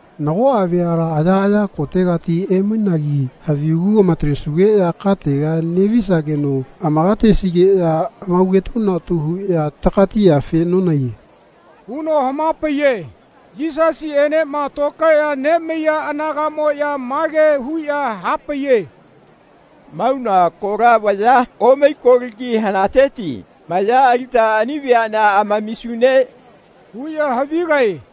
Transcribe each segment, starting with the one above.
Nagoꞌa veala ayaꞌaya kotegati emainagi havigu amatalesugeꞌya katega neꞌvisageno amakatesigeꞌya amaugetunatu huꞌya takatiyafena nonahaiye.” huno hamapaiye. Yisasiꞌenema tokaeꞌya nemaiya anagaꞌmoꞌya mage huꞌya hapaiye “Mauna kola vaya omai kolagi hanateti maya alita ani veaꞌnea amamisune?” huꞌya havigae.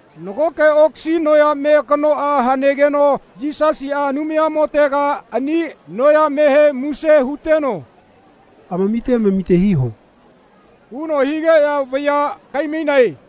Nagoke okasi noyame kanoꞌa hanegeno Yisasiꞌa Anumayamotega ani noyamehe muse huteno “Amamite amamite hiho.” huno higeꞌya vaya kaimainae.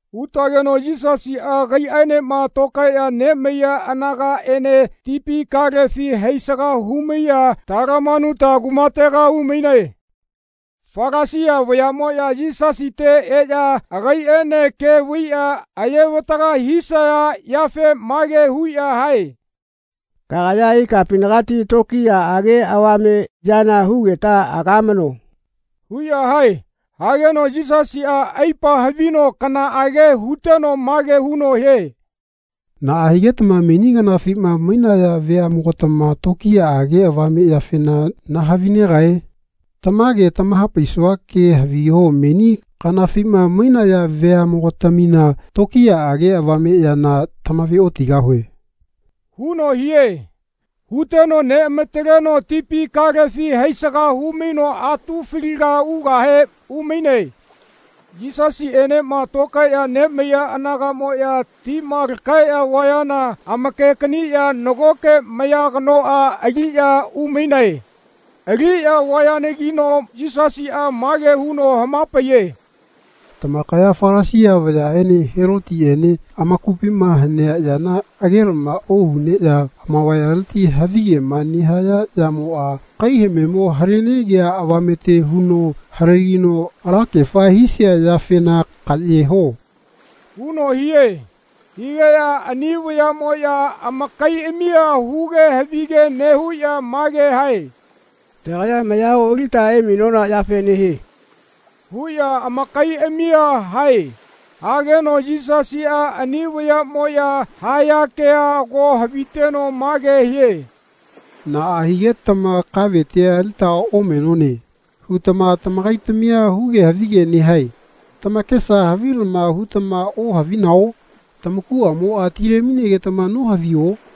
Utageno Yisasiꞌa agaiꞌaenema tokaeꞌya nemaiya anagaꞌene tipi kalefi haisaga humaiꞌya Talamanuta kumatega umainae. Falasia vayaꞌmoꞌya Yisasite eꞌya agaiꞌene ke vaiꞌya ayevataga hisaya yafe mage huꞌya hae “Kagaya ikapinagati tokiyaꞌage avame yana hugeta agamano.” huꞌya hae. Hageno Yisasiꞌa aipa havino kanaꞌage huteno mage huno hie “Naꞌa higetama meni kanafima mainaya veaꞌmogatama tokiyaꞌage avame yafena nahavinegae? Tamage tamahapaisua kea haviho meni kanafima mainaya veaꞌmogatamina tokiyaꞌage avame yana tamaveotigahue.” huno hie. Huteno neꞌamataleno tipi kalefi haisaga humaino atu faliga ugahe umaine. Yisasiꞌenema tokaeꞌya nemaiya anagaꞌmoꞌya tima lakaeꞌya vayana amakekaniꞌya nagoke maya kanoꞌa aliꞌya umainae. Aliꞌya vayanagino Yisasiꞌa mage huno hamapaiye “Tamakaya Falasia vayaꞌene Helotiꞌene amakupima hanea yana agelama ohuneꞌya amavayaleti havigema nehaya yamoꞌa kaihamemo halenegia avamete huno halegino alakefa hisia yafena kaꞌye ho.” huno hie. Higeꞌya ani vayaꞌmoꞌya amakaiꞌamia huge havige nehuꞌya mage hae “Tagaya maya oꞌalita emainona yafe nehie.” huꞌya amakaiꞌamia hae. Hageno Yisasiꞌa ani vayaꞌmoꞌya haya kea ago haviteno mage hie “Naꞌa higetama ‘Kavetia alita omenone.’ hutama tamakaitamia huge havige nehae. Tamakesa havilama hutama ohavinao? Tamakuꞌamoꞌa tilemainegetama nohavio?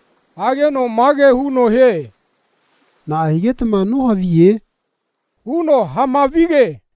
Hageno mage huno hie “Naꞌa higetama nohaviye?” huno hamavige.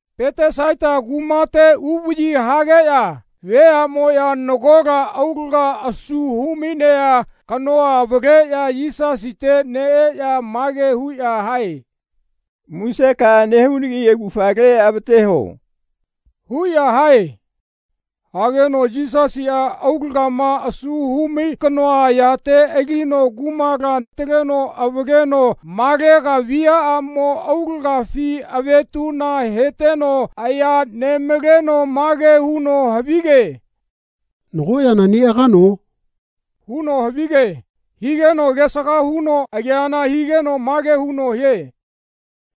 Petesaita kumate uvaꞌyi hageꞌya veaꞌmoꞌya nagola aulaga asu humainea kanoa avaleꞌya Yisasite neꞌeꞌya mage huꞌya hae “Musekaꞌa nehunagi augafale avate huo.” huꞌya hae. Hageno Yisasiꞌa aulagama asu humai kanoa ayate alino kumala ataleno avaleno malaga viaꞌamo aulagafi avetuꞌna heteno aya nemaleno mage huno havige “Nago yana neꞌagano?” huno havige. Higeno agesaga huno ageana higeno mage huno hie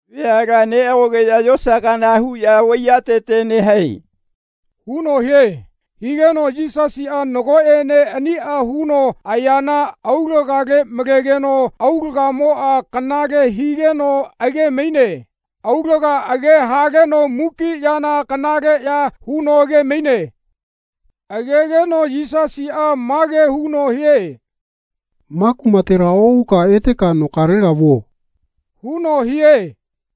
“Veala neꞌagogeꞌya yosa kana huꞌya vaiyatete nehae.” huno hie. Higeno Yisasiꞌa nagoꞌene aniꞌa huno ayana aulagale malegeno aulagamoꞌa kanale higeno agemaine. Aulaga age haleno muki yana kanaleꞌya huno agemaine. Agegeno Yisasiꞌa mage huno hie “Ma kumatela oꞌuka eteka nokalega vuo.” huno hie.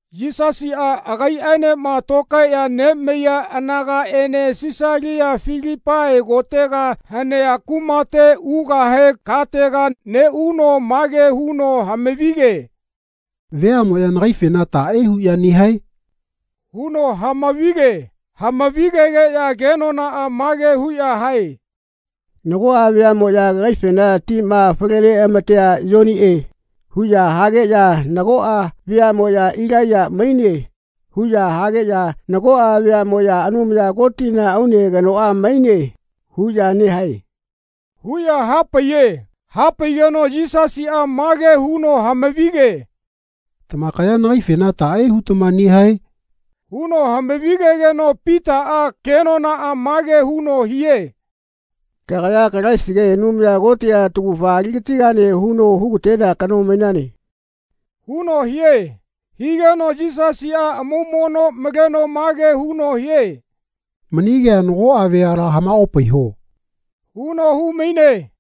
Yisasiꞌa agaiꞌaenema tokaeꞌya nemaiya anagaꞌene Sisalia Filipai kotega hanea kumate ugahe katega neꞌuno mage huno hamavige “Veaꞌmoꞌya nagaifena taꞌe huꞌya nehae?” huno hamavige. Hamavigegeꞌya kenonaꞌa mage huꞌya hae “Nagoꞌa veaꞌmoꞌya kagaifena ‘Tima fale neꞌamatea Yoniꞌe.’ huꞌya hageꞌya nagoꞌa veaꞌmoꞌya ‘Ilaiya maine.’ huꞌya hageꞌya nagoꞌa veaꞌmoꞌya ‘Anumaya Kotina aune kanoꞌa maine.’ huꞌya nehae.” huꞌya hapaiye. Hapaigeno Yisasiꞌa mage huno hamavige “Tamakaya nagaifena taꞌe hutama nehae?” huno hamavigegeno Pitaꞌa kenonaꞌa mage huno hie “Kagaya Kalaisigae Anumaya Kotiꞌa taugafa aligatigane huno hugatenea kano mainane.” huno hie. Higeno Yisasiꞌa amaumono maleno mage huno hie “Mani kea nagoꞌa veala hamaopaiho.” huno humaine.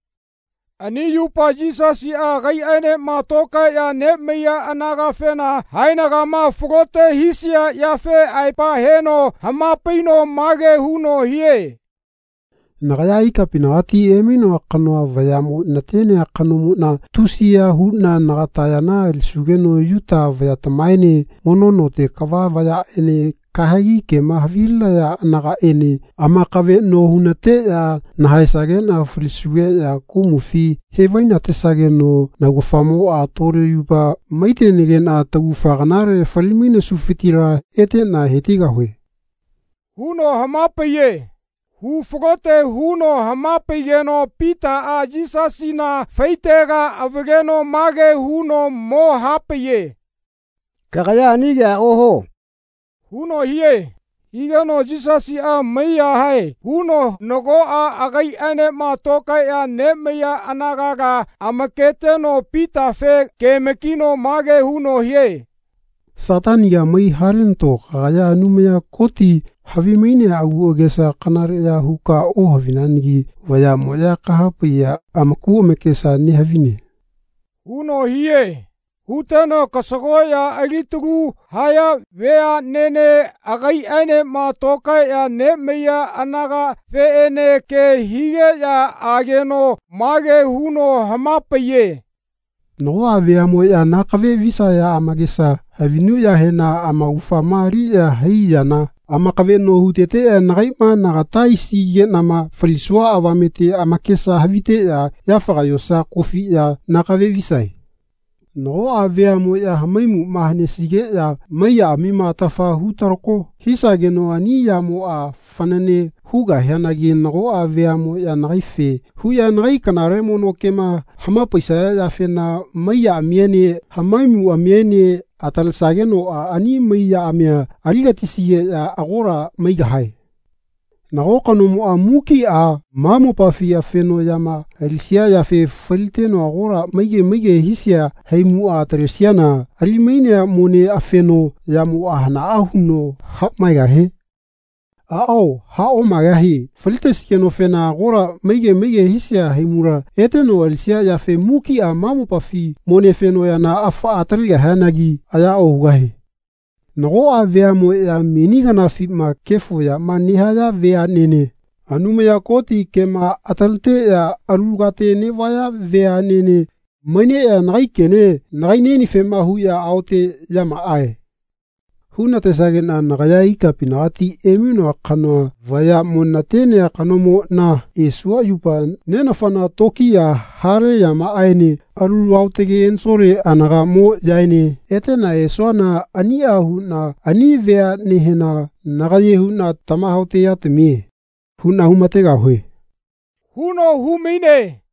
Ani yupa Yisasiꞌa agaiꞌaenema tokaeꞌya nemaiya anagafena haenagama falote hisia yafe aepa heno hamapaino mage huno hie “Nagaya ikapinagati emainoa kanoa vayaꞌmo natenea kanomoꞌna tusiya huꞌna nagata yana alisugeno Yuta vayatamaene mono note kava vayaꞌene kahegi kema havilinaya anagaꞌene amakaveꞌno hunateꞌya nahaesageꞌna falisugeꞌya komufi hevainatesageno naugafamoꞌa tole yupa maitenageꞌna tagufa kanale falimainesufitila eteꞌna hetigahue.” huno hamapaiye. Hufalote huno hamapaigeno Pitaꞌa Yisasina faitega avaleno mage huno mo hapaiye “Kagaya ani kea ohuo.” huno hie. Higeno Yisasiꞌa maiyahae huno nagoꞌa agaiꞌaenema tokaeꞌya nemaiya anagala amaketeno Pitafe keamakino mage huno hie “Sataniga mai halenato kagaya Anumaya Koti havimainea aguꞌagesa kanaleꞌya huka nohavinagi vayaꞌmoꞌya kahapaiya amaku amakesa nehavine.” huno hie. Huteno kasagoꞌya alitalu haya veaꞌnene agaiꞌaenema tokaeꞌya nemaiya anagafeꞌene ke higeꞌya ageno mage huno hamapaiye “Nagoꞌa veaꞌmoꞌya nakave visaya amakesa havinuꞌyahena amaugafama aliꞌya hai yana amakaveꞌno huteteꞌya nagaiꞌma nagata aisigeꞌnama falisua avamete amakesa haviteꞌya yafaga yosa kofiꞌya nakave visae. Nagoꞌa veaꞌmoꞌya hamaimuꞌma hanesigeꞌya mai yaꞌamima atafa hutalako hisagenoꞌa ani yamoꞌa fanane hugahianagi nagoꞌa veaꞌmoꞌya nagaife huꞌya nagai kanale mono kema hamapaisaya yafema mai yaꞌamiene hamaimuꞌamiene atalesagenoꞌa ani mai yaꞌami aligatisigeꞌya agola maigahae. Nago kanomoꞌa mukiꞌa ma mopafi afeno yama alisia yafe faliteno agola maige maige hisia haimuꞌa atalesiana alimainea mone afeno yamoꞌa hanaꞌa huno haꞌmaegahie? Aꞌao haꞌomaegahie Falitesigenofena agola maige maige hisia haimula eteno alisia yafe mukiꞌa ma mopafi mone fenoꞌyana afaꞌa atalegahianagi aya ohugahie. Nagoꞌa veaꞌmoꞌya meni kanafina kefo yama nehaya veaꞌnene, Anumaya Koti kema ataleteꞌya alu kate neꞌvaya veaꞌnene, maineꞌya nagai kene nagaiꞌnienefema huꞌya ‘Aoteꞌyamaꞌae.’ hunatesageꞌna nagaya ikapinagati emainoa kanoa vayaꞌmo natenea kanomoꞌna esua yupa Nenafana tokiya hale yamaꞌaene alu aotage ensole anagaꞌmoꞌyaene eteꞌna esuana aniꞌa huꞌna ani veaꞌnehena nagaye huꞌna ‘Tamahaoteꞌyatamie.’ huꞌna humategahue.” huno humaine.